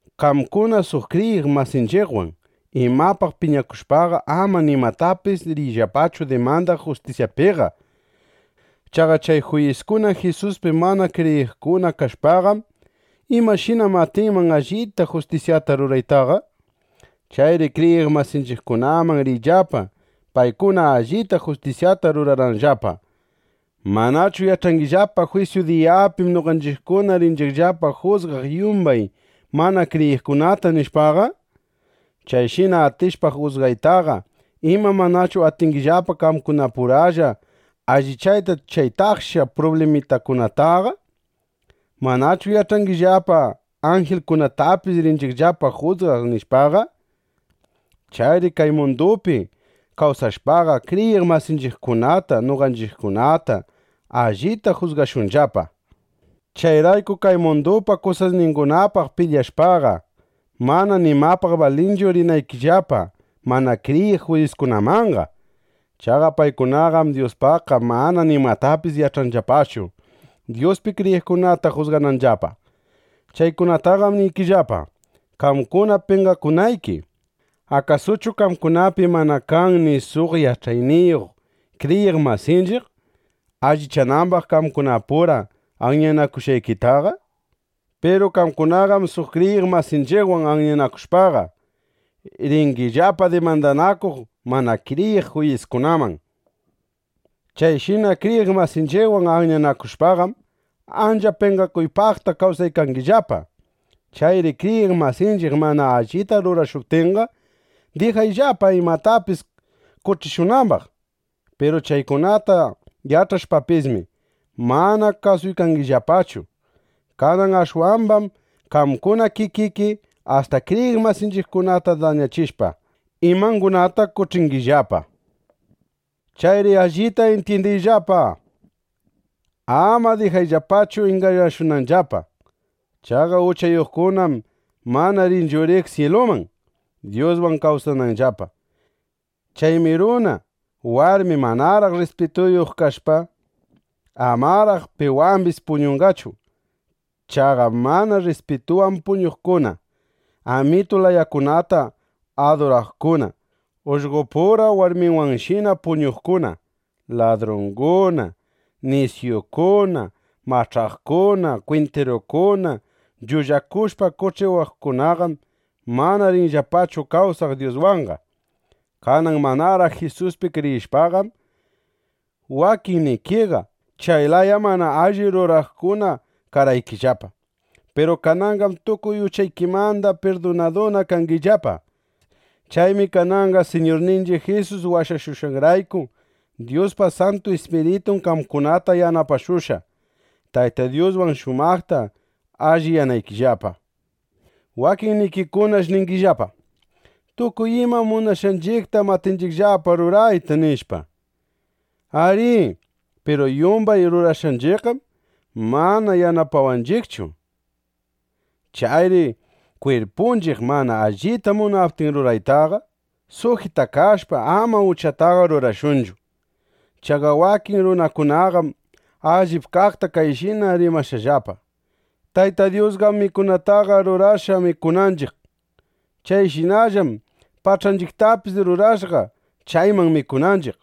Qamkuna suq kriyiq masinchiqwan imapaq piñakushpaqa, ama nimatapis riyllapachu dimandaq juyiskunapiqa. Chaqa chay juyiskuna Jisuspi mana kriyiqkuna kashpaqam, ¿imashinam atinman allita justisyata ruraytaqa? Chayri kriyiq masinchiqkunaman riyllapa, paykuna allita justisyata rurananllapa. ¿Manachu yach'angillapa: Jwisyu diyapim noqanchiqkuna rinchiqllapa jusgaq yumbay mana kriyiqkunata, nishpaqa? Chayshina atishpa jusgaytaqa, ¿ima manachu atingillapa qamkunapuralla allichayta chay taksha prublimakunataqa? ¿Manachu yach'angillapa: Anjilkunatapis rinchiqllapa jusgaq, nishpaqa? Chayri kay mundupi kawsashpaqa, kriyiq masinchiqkunata noqanchiqkuna allita jusgashunllapa. Chayrayku kay mundupa kusasningunapaq pilyashpaqa, mana nimapaq balinchu rinaykillapa mana kriyiq juyiskunamanqa. Chaqa paykunaqam Dyuspaqqa mana nimatapis yach'anllapachu, Dyuspi kriyiqkunata jusgananllapa. Chaykunataqam niykillapa, qamkuna penqakunayki. ¿Akasuchu qamkunapi mana kan ni suq yach'ayniyuq kriyiq masinchiq, allichanambaq qamkunapura anyanakushqaykita? ¡Piru qamkunaqam suq kriyiq masinchiqwan anyanakushpaqa, ringillapa dimandanakuq mana kriyiq juyiskunaman! Chayshina kriyiq masinchiqwan anyanakushpaqam, ancha penqakuypaqta kawsaykangillapa. Chayri kriyiq masinchiq mana allita rurashuptinqa, dijayllapa imatapis qoch'ishunambaq. Piru chaykunata yach'ashpapismi, mana kasungillapachu. Kanan ashwambam qamkuna kikiki asta kriyiq masinchiqkunata dañachishpa, imangunata qoch'ingillapa. Chayri allita intyindiyllapa. Ama dijakayllapachu ingañashunanllapa. Chaqa uchayuqkunaqam mana rinchu riq syiluman, Dyuswan kawsananllapa. Chaymi runa, warmi manaraq rrispituyuq kashpa, amaraq piwambis puñunqachu. Chaqa mana rrispitunwan puñuqkuna, amitu layakunata aduraqkuna, ullqopura warmiwanshina puñuqkuna, ladrunguna, nisyukuna, mach'aqkuna, kwintirukuna, llullakushpa qoch'ikuqkunaqam mana rinllapachu kawsaq Dyuswanqa. Kanan manaraq Jisuspi kriyishpaqam, wakinnikiqa chay laya mana alli ruraqkuna karqaykillapa. Piru kananqam tukuy uchaykimanda pirdunaduna kangillapa. Chaymi kananqa Siñurninchiq Jisus washashushqanrayku, Dyuspa Santu Ispiritun qamkunata yanapashushqa, Tayta Dyuswan shumaqta alliyanaykillapa. Wakinnikikunash ningillapa: “Tukuy ima munashqanchiqtam atinchiqllapa rurayta”, nishpa. Arí, piru yumbay rurashqanchiqqam mana yanapawanchiqchu. Chayri kwirpunchiq mana allita munaptin ruraytaqa, sujitashpa, ama uchataqa rurashunchu. Chaqa wakin runakunaqam allip kaqta kayshina rimashqallapa: “Tayta Dyusqam mikunataqa rurashqa mikunanchiq. Chayshinallam pach'anchiqtapis rurashqa, chayman mikunanchiq.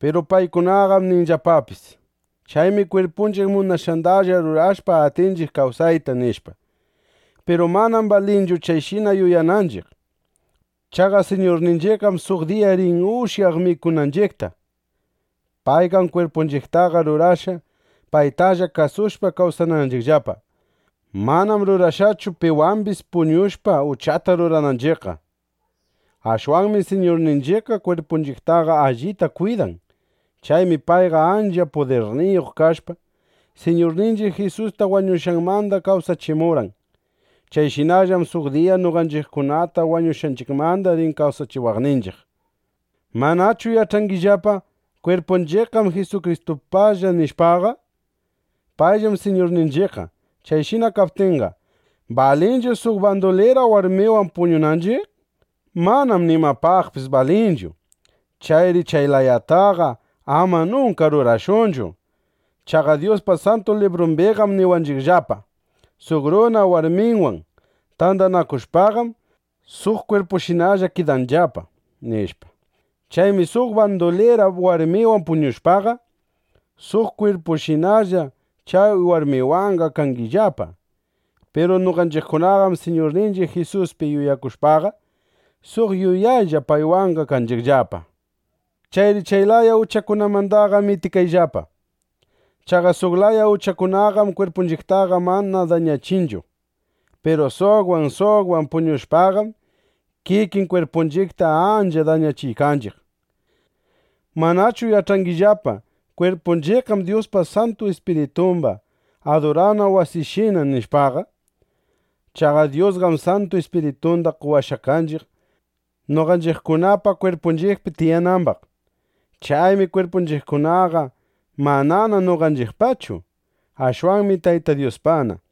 (Piru paykunaqam ninllapapis: Chaymi kwirpunchiq munashqandalla rurashpa, atinchiq kawsayta”, nishpa.) Piru manam balinchu chayshina yuyananchiq. Chaqa Siñurninchiqqam suq diya rin ushyaq pach'anchiqta, mikunanchiqtapis. Payqam kwirpunchiqtaqa rurashqa, paytalla kasushpa kawsananchiqllapa. Manam rurashqachu, piwambis puñushpa, uchata rurananchiqqa. Ashwanmi Siñurninchiqqa kwirpunchiqtaqa allita kwidan. Chaymi payqa ancha pudirniyuq kashpa, Siñurninchiq Jisusta wañushqanmanda kawsachimurqan. Chayshinallam suq diya noqanchiqkunata wañushqanchiqmanda rin kawsachiwaqninchiq. ¿Manachu yach'angillapa: Kwirpunchiqqam Jisukristupalla, nishpaqa? Payllam Siñurninchiqqa. Chayshina kaptinqa, ¿balinchu suq bandulira warmiwan puñunanchiq? ¡Manam nimapaqpis balinchu! ¡Chayri chay layataqa ama nunka rurashunchu! Chaqa Dyuspa Santu Librumbiqam niwanchiqllapa: “Suq runa warmiwan tandanakushpaqam, suq kwirpushinalla kidanllapa”, nishpa. Chaymi suq bandulira warmiwan puñushpaqa, suq kwirpushinalla chay warmiwanqa kanchiqllapa. Piru noqanchiqkunaqam Siñurninchiq Jisuspi yuyakushpaqa, suq yuyaylla paywanqa kanchiqllapa. Chayri chay laya uchakunamandaqa mitikayllapa. Chaqa suq laya uchakunaqam kwirpunchiqtaqa mana dañachinchu. Piru suqwan suqwan puñushpaqam, kikin kwirpunchiqta ancha dañachiykanchiq. ¿Manachu yach'angillapa: Kwirpunchiqqam Dyuspa Santu Ispiritumba adurana wasinshina, nishpaqa? Chaqa Dyusqam Santu Ispiritunda qowashqa kanchiq, noqanchiqkunapa kwirpunchiqpi tiyanambaq. Chaymi kwirpunchiqkunaqa manana noqanchiqpachu; ashwanmi Tayta Dyuspana.